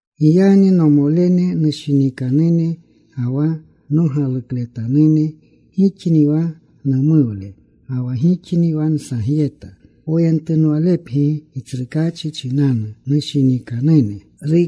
Giyagni nomolene nushinikanune ga wa nogalukletanune, gixni wa numuwle ga wa gixni wa nsagyeta. Poyentunwalepgi Gitsrukaachi chinanu, nushinikanune.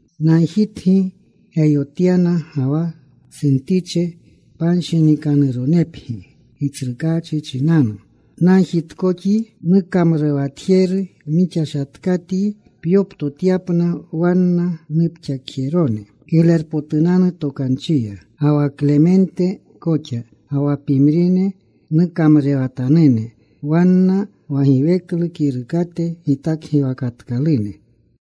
Nagjitgi Geyotyana ga wa Suntiche panshinikanuronepgi Gitsrukaachi chinanu. Nagjitkoxyi, nukamrurewatjeru mixashatkatyi, pyoptotyapna wanna nupxakjerone Kiglerpotunanu Tokanchiya, ga wa Klemente koxa, ga wa pimrine nukamrurewatanune, wanna wa giweklu kirukate gitakgiwakatkalune.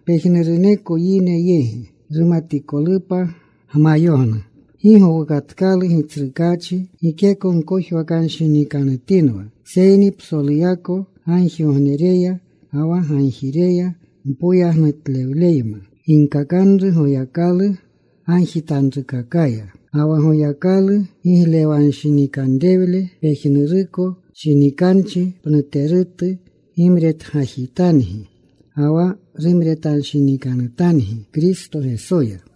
Pejnuruneko yine yegi rumatikolupa gmayognu. Gi gowukatkalu Gitsrukaachi. Gikeko gkojwakanshinikanutinwa. Seyni psoluyako gagjigognereya ga wa gagjireya mpoyagnutlewleyma, ginkakanru Goyakalu gagjitanrukakaya. Ga wa Goyakalu giglewanshinikanrewle pejnuruko shinikanchi pnuterutu gimretgajitangi ga wa rumretanshinikanutangi Kristo Gesoya.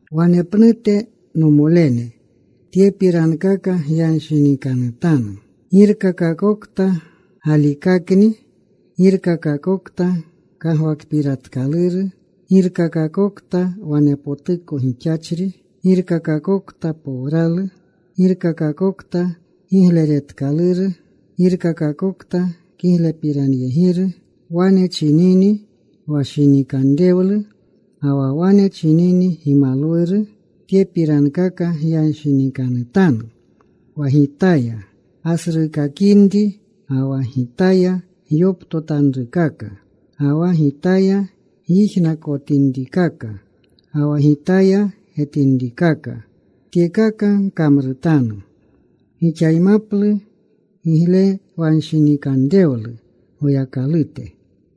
Wanepnute, nomolene, tyepirankaka gyanshinikanutanu: girkakakokta galikakni, girkakakokta kagwakpiratkaluru, girkakakokta wanepotuko gixachri, girkakakokta powralu, girkakakokta gigleretkaluru, girkakakokta kiglepiranyegiru, wane chinini wa shinikanrewlu ga wa wane chinini gimalwuru, tyepirankaka gyanshinikanutanu. Wa gitaya gasruukakinri, ga wa gitaya gyoptotanrukaka, ga wa gitaya gyijnakotinrikaka, ga wa gitaya getinrikaka, tyekaka gkamrutanu. Gixaymaplu giglewanshinikanrewlu Goyakalute.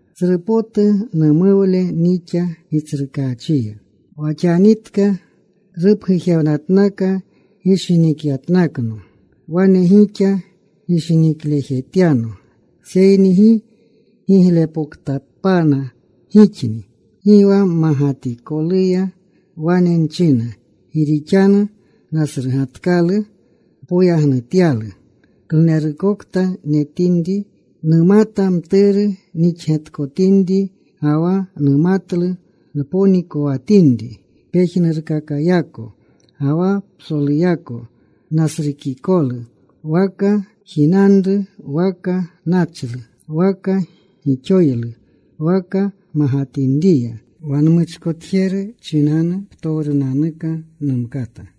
Tsru potu numuwle nixa Gitsrukaachiya wa xanitka rupgujewnatnaka gishinikyatnakno. Wane gixa gishiniklejetyano, seyni gi giglepoktapana gixni. Gi wa magatikoluya wane nchina. Gi rixanu nasrugatkalu npoyagnutyalu klunerukokta netinri. Numata mturu nixletkotinri, ga wa numatlu nponikowatinri. Pejnurkakayako ga wa psoluyako nasrukikolu, waka jinanru waka nachlu, waka gixoylu waka magatinriya. Wa nmuchkotjeru chinanu, ptowrunanuka numkata.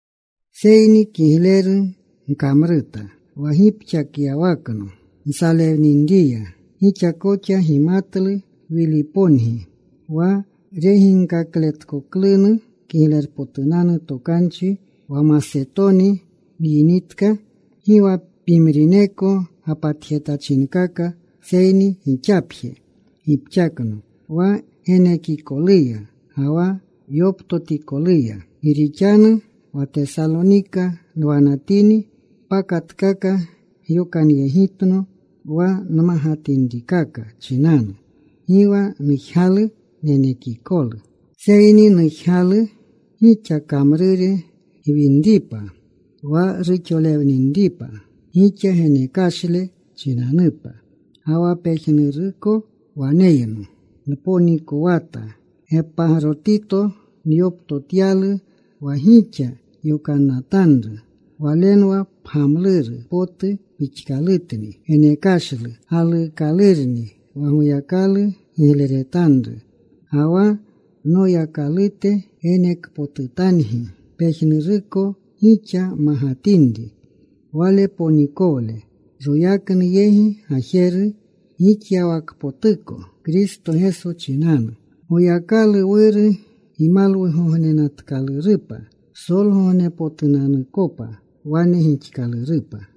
Seyni kigleru gkamruta wa gipxakyawakno nsalewninriya. Gixa koxa gimatlu, Wilipongi, wa reginkakletkoklunu Kiglerpotunanu Tokanchi, wa Masetoni nyinitka, gi wa pimrineko gapatjetachinkaka seyni gixapje gipxakno wa genekikoluya ga wa yoptotikoluya. Gi rixanu wa Tesalonika nwanatini pakatkaka gyokanyegitno wa nmagatinrikaka chinanu. Gi wa nujgalu nenekikolu, seyni, nujgalu gixa kamrure gwinripa, wa ruxolewninripa gixa genekashle chinanupa. Ga wa pejnuruko waneyno. Nponikowata. Gepagrotito nyoptotyalu wa gixa yokanatanru. Walenwa pgamluru potu pixkalutni. Genekashlu galuukalurni, wa Goyakalu gigleretanru. Ga wa Noyakalute genekpotutangi pejnuruko gixa magatinri Wale ponikowle, royaknu yegi gajeru gixyawakpotuko Kristo Geso chinanu. Goyakalu Wuru gimalwugognenatkalurupa psolgognepotunanukopa. Wane gixkalurupa.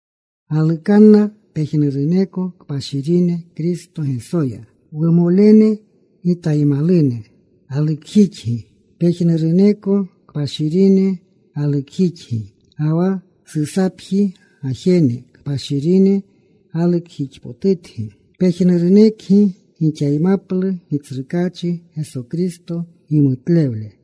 Galukanna pejnuruneko kpashirine Kristo Gesoya. Wumolene gitaymalune galukjixgi. Pejnuruneko kpashirine galukjixgi, ga wa Susapji gajene kpashirine galukjixpotutgi. Pejnurunekgi gixaymaplu Gitsrukaachi Geso Kristo gimutlewle.